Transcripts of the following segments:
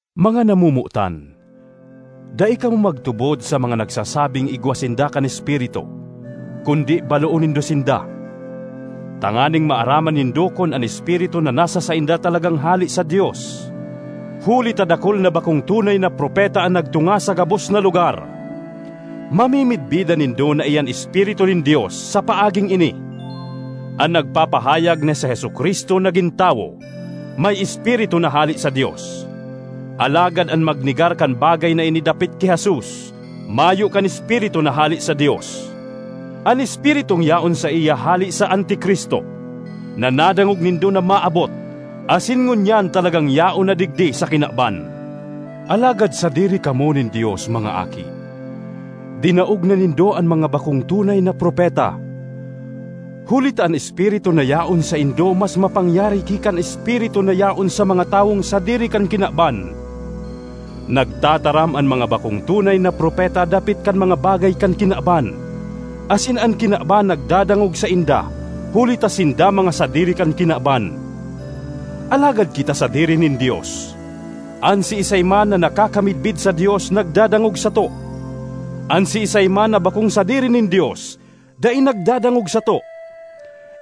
Mga namomotan, dai kamo magtubod sa mga nagsasabing igwa sinda kan Espiritu, kundi baloon nindo sinda, tanganing maaraman nindo kun an espiritu na nasa sainda talagang hale sa Dios; huli ta dakul na bakong tunay na propeta an nagtunga sa gabos na lugar. Mamimidbidan nindo na iyan Espiritu nin Dios sa paaging ini: an nagpapahayag na si Jesu-Cristo nagin tawo, may Espiritu na hale sa Dios. Alagad an magnegar kan bagay na ini dapit ki Jesus, mayo kan Espiritu na hale sa Dios. An espiritung yaon saiya hale sa Anti-Cristo, na nadangog nindo na maabot, asin ngunyan talagang yaon na digdi sa kinaban. Alagad sadiri kamo nin Dios, mga aki. Dinaog na nindo an mga bakong tunay na propeta, huli ta an Espiritu na yaon saindo mas mapangyari ki kan espiritu na yaon sa mga tawong sadiri kan kinaban. Nagtataram an mga bakong tunay na propeta dapit kan mga bagay kan kinaban, asin an kinaban nagdadangog sainda huli ta sinda mga sadiri kan kinaban. Alagad kita sadiri nin Dios. An siisay man na nakakamidbid sa Dios nagdadangog sato; an siisay man na bakong sadiri nin Dios dai nagdadangog sato.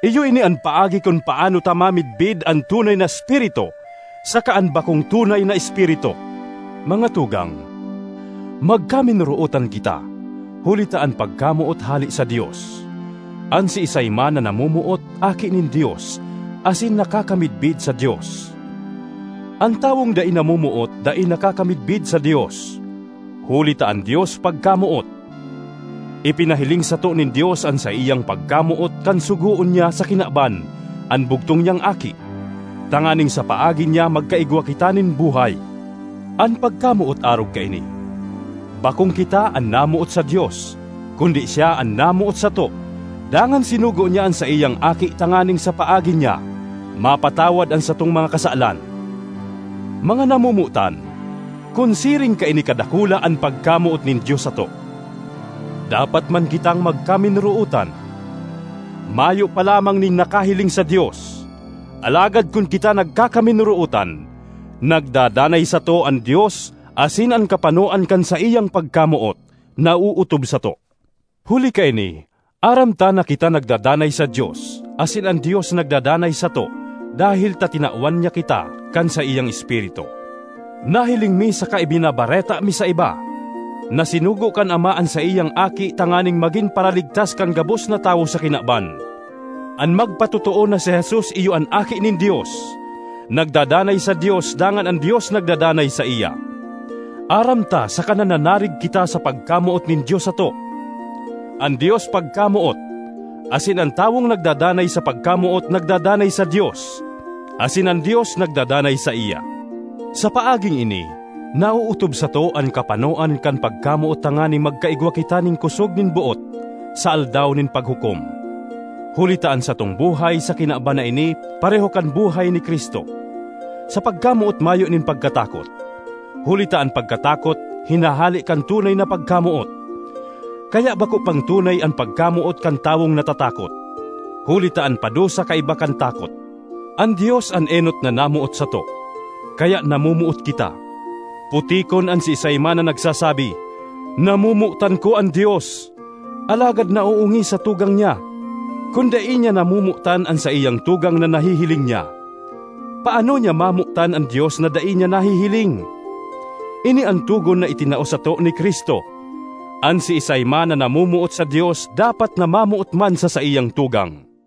Iyo ini an paagi kun paano ta mamidbid an tunay na espiritu saka an bakong tunay na espiritu. Mga tugang, magkaminorootan kita, huli ta an pagkamoot hale sa Dios. An siisay man na namomoot, aki nin Dios asin nakakamidbid sa Dios. An tawong dai namomoot, dai nakakamidbid sa Dios, huli ta an Dios pagkamoot. Ipinahiling sato nin Dios an saiyang pagkamoot kan sugoon niya sa kinaban an bugtong niyang Aki, tanganing sa paagi niya magkaigwa kita nin buhay. An pagkamoot arog kaini: bakong kita an namoot sa Dios, kundi siya an namoot sato dangan sinugo niya an saiyang Aki tanganing sa paagi niya mapatawad an satong mga kasalan. Mga namomotan, kun siring kaini kadakula an pagkamoot nin Dios sato, dapat man kitang magkaminorootan. Mayo pa lamang nin nakahiling sa Dios, alagad kun kita nagkakaminorootan, nagdadanay sato an Dios asin an kapanoan kan saiyang pagkamoot naootob sato. Huli kaini aram ta na kita nagdadanay sa Dios asin an Dios nagdadanay sato dahel ta tinawan niya kita kan saiyang Espiritu. Nahiling mi saka ibinabareta mi sa iba na sinugo kan Ama an saiyang Aki tanganing magin Paraligtas kan gabos na tawo sa kinaban. An magpatotoo na si Jesus iyo an Aki nin Dios, nagdadanay sa Dios dangan an Dios nagdadanay saiya. Aram ta saka nananarig kita sa pagkamoot nin Dios sato. An Dios pagkamoot, asin an tawong nagdadanay sa pagkamoot nagdadanay sa Dios, asin an Dios nagdadanay saiya. Sa paaging ini naootob sato an kapanoan kan pagkamoot tanganing magkaigwa kita nin kosog nin boot sa Aldaw nin Paghukom, huli ta an satong buhay sa kinaban na ini pareho kan buhay ni Cristo. Sa pagkamoot mayo nin pagkatakot; huli ta an pagkatakot hinahale kan tunay na pagkamoot. Kaya bako pang tunay an pagkamoot kan tawong natatakot, huli ta an padusa kaiba kan takot. An Dios an enot na namoot sato, kaya namomoot kita. Putikon an siisay man na nagsasabi, “Namomotan ko an Dios,” alagad naoongis sa tugang niya. Kun dai niya namomotan an saiyang tugang na nahihiling niya, paano niya mamotan an Dios na dai niya nahihiling? Ini an togon na itinao sato ni Cristo: an siisay man na namomoot sa Dios dapat na mamoot man sa saiyang tugang.